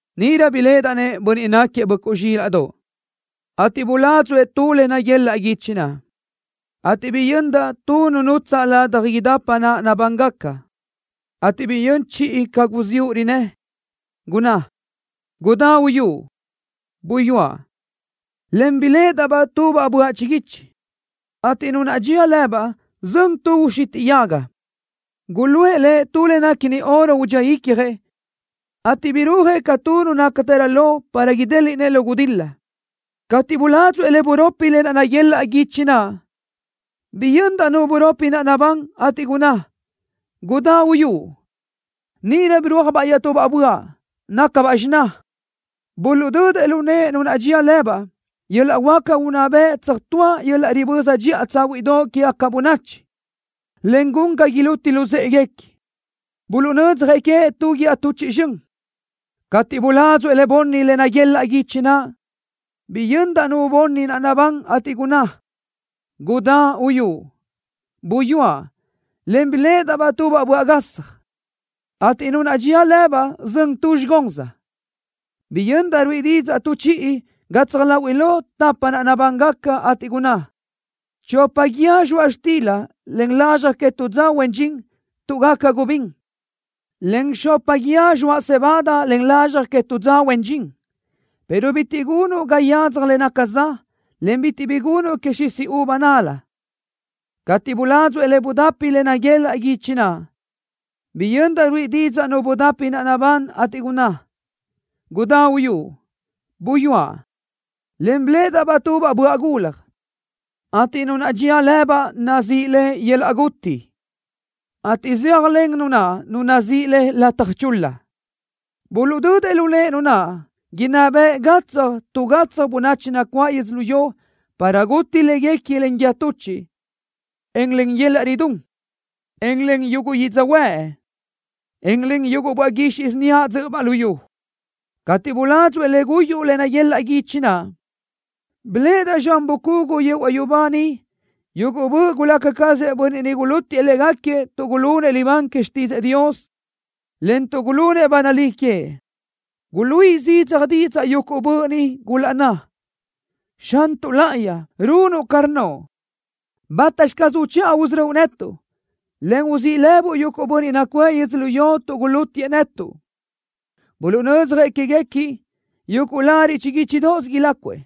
Níʼirö biléʼedaʼ-nëʼ Bönniʼ náquiëʼ Böʼcuʼ Zxílaʼdoʼ, ateʼ buládzuʼë tu le naguelaʼ guichi naʼ, ateʼ biyöndaʼ tu nu nutsaʼ ladaj idapa naʼ nabángaca, ateʼ biyö́n chiʼi ca guziúʼ rinnë́, gunná: “¡Gudá uyúʼ!” Buyúaʼ, en biléʼedaʼ-baʼ tubaʼ böaʼ chiguichi, ateʼ nu naʼ dxía lëbaʼ zön tu uxitiʼ yaga. Guluʼë lëʼ tu le néquini oro udxíëʼ icjëʼ, ateʼ birúajëʼ ca tu nu nácatërö lo para idéliʼnëʼ lu gudil-la. Cateʼ buládzuʼë le buropi le naguelaʼ guichi naʼ, biyöndaʼ nu buropi naʼ nabán, ateʼ gunná: “¡Gudá uyúʼ!” Níʼirö birúajbaʼ iaʼtubaʼ böaʼ, nácabaʼ xiná. Buluʼdödëʼ lu nëʼe nu naʼ dxía lëbaʼ yöl-laʼ huáca unná bëʼ tsöjtúa yöl-laʼ riböza dxiʼa tsáhuiʼdoʼ quégaca bönachi, en gun ga iluti luzë́ʼeguequi. Buluʼnödzjëʼ queëʼ tu guíë tuchiʼ zxön. Cateʼ buládzuʼë le bunni le naguelaʼ guichi naʼ, biyöndaʼ nu bunni naʼ nabán, ateʼ gunná: “¡Gudá uyúʼ!” Buyúaʼ, en biléʼedaʼ-baʼ tubaʼ böaʼ gasaj, ateʼ nu naʼ dxía lëbaʼ zön tu zxigóns. Biyöndaʼ ruíʼi didzaʼ tu chiʼi gatsaj láhuiʼlö tapa naʼ nabángaca, ateʼ gunná: “Chopa guíë zxoaʼ xtila len lazxaj que tu dza huen dxin tuʼ gaca gubín, en xopa guíë zxoaʼ cebada len lazxaj que tu dza huen dxin, pero bitiʼ gunuʼ ga yadzaj le naca za, en bitiʼ bi gunuʼ que xisi uva nal-la.” Cateʼ buládzuʼë le budapi le naguelaʼ guichi naʼ, biyöndaʼ ruíʼi didzaʼ nu budapi naʼ nabán, ateʼ gunná: “¡Gudá uyúʼ!” Buyúaʼ, en biléʼedaʼ-baʼ tubaʼ böaʼ gulaj, ateʼ nu naʼ dxía lëbaʼ nazíʼi le Yöl-laʼ Guti, ateʼ zéajlen nu naʼ nu nazíʼi le Lataj Chul-la. Buluʼdödëʼ lu nëʼe nu naʼ inná beʼe gatsaj tu gatsaj bönachi nacuáʼ yödzölió para guti léguequi len guíë tuchiʼ, en len yöl-laʼ ridún, en len yuguʼ yödzöhuë́ʼ, en len yuguʼ böaʼ guixiʼ síniaʼ dzö́ʼöbaʼ luyú. Cateʼ buládzuʼë le guyuʼ le naguelaʼ guichi naʼ, biléʼedaʼ zxan bucugu yehuaʼ yubá niʼ yuguʼ böʼ gulaca cazëʼ bönniʼ niʼ gulútiëʼ légaquiëʼ tuʼ gulunëʼ libán que xtídzëʼë Dios, en tuʼ gulunëʼ ba nalí queëʼ. Guluíʼi zidzaj didzaʼ yuguʼ böʼ ni, gulaʼnná: “¡Xantuʼ Láʼayi, runuʼ ca rnnoʼ! ¿Bátaxi caz uchiʼa usörö́uʼ queë́tuʼ, en uzíʼi lëbuʼ yuguʼ bönniʼ nacuʼë yödzölió tuʼ gulútiëʼ netuʼ?” Buluʼnödzjëʼ quéguequi yuguʼ lariʼ chiguíchidoʼos ilácuëʼ,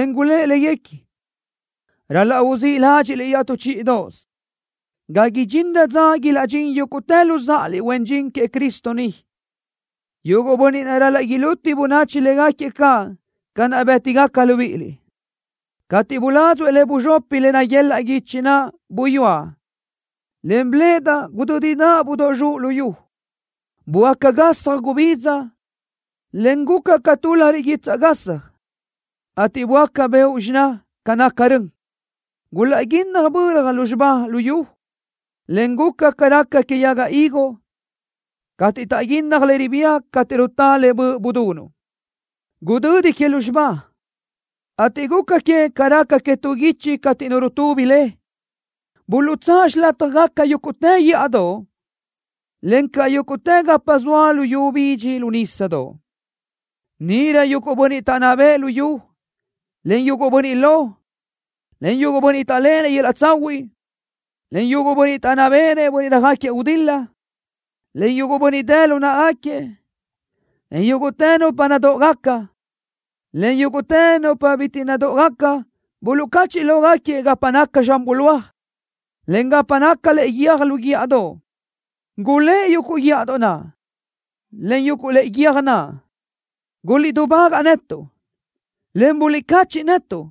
en gulë́ʼ léguequi: “Ral-laʼ uzíʼ ládxiʼliʼ iaʼtú chíʼidoʼosö, ga idxinrö dza ilaʼdxín yúguʼtë luzáʼaliʼ huen dxin queëʼ Cristo ni, yuguʼ bönniʼ naʼ ral-laʼ iluti bönachi légaquiëʼ caʼ ca naʼ bë́tigaca libíʼiliʼ.” Cateʼ buládzuʼë le buzxopi le naguelaʼ guichi naʼ, buyúaʼ, en biléʼedaʼ gudö́didaʼ budóʼ zxuʼ luyú. Böáca gasaj gubidza, en guca ca tu lariʼ guitsaʼ gasaj, ateʼ böáca beoʼ xiná ca naca rön. Gulaʼguínnaj bölaj lúzxiba lu yu, le guca ca raca que yaga higo, cateʼ taʼguínnaj le ribía cateʼ rutá le böʼ budunuʼ. Gudödi que lúzxiba, ateʼ guca que ca raca que tu guichi cateʼ nu rutubi le. Buluʼtsáʼ xilátjagaca yúguʼtë guíʼadoʼ, encaʼ yúguʼtë gapa zoa luyú bidxi lu nísadoʼ. Níʼirö yuguʼ bönniʼ taʼnná bëʼë luyú, en yuguʼ bönniʼ lo, en yuguʼ bönniʼ taʼléʼenëʼ yöl-laʼ tsahuiʼ, en yuguʼ bönniʼ taʼnná béʼenëʼ bönniʼ röjáquiëʼ gudil-la, en yuguʼ bönniʼ dë lu náʼagaquiëʼ, en yúguʼtë nupa nadóʼogaca, en yúguʼtë nupa bitiʼ nadóʼogaca buluʼcachiʼ lógaquiëʼ gapa naca zxan bulóaj, en gapa naca lëʼe guiö́j lu guíʼadoʼ. Gulë́ʼ yuguʼ guíʼadoʼ naʼ, en yuguʼ lëʼe guiö́j naʼ: “Guliʼdubágaʼ netuʼ, en buliʼcachiʼ netuʼ,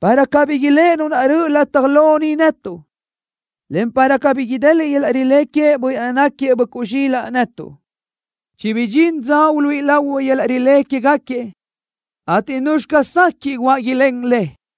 para cabí iléʼe Nu naʼ röʼö lataj lo niʼ netuʼ, en para cabí ideliʼ yöl-laʼ rilé queëʼ Bönniʼ naʼ náquiëʼ Böʼcuʼ Zxílaʼdoʼ netuʼ. Chibidxín dza uluíʼi lahui yöl-laʼ rilé quégaquiëʼ, ateʼ ¿nuzxi caz sequiʼ guáʼ ilén le?”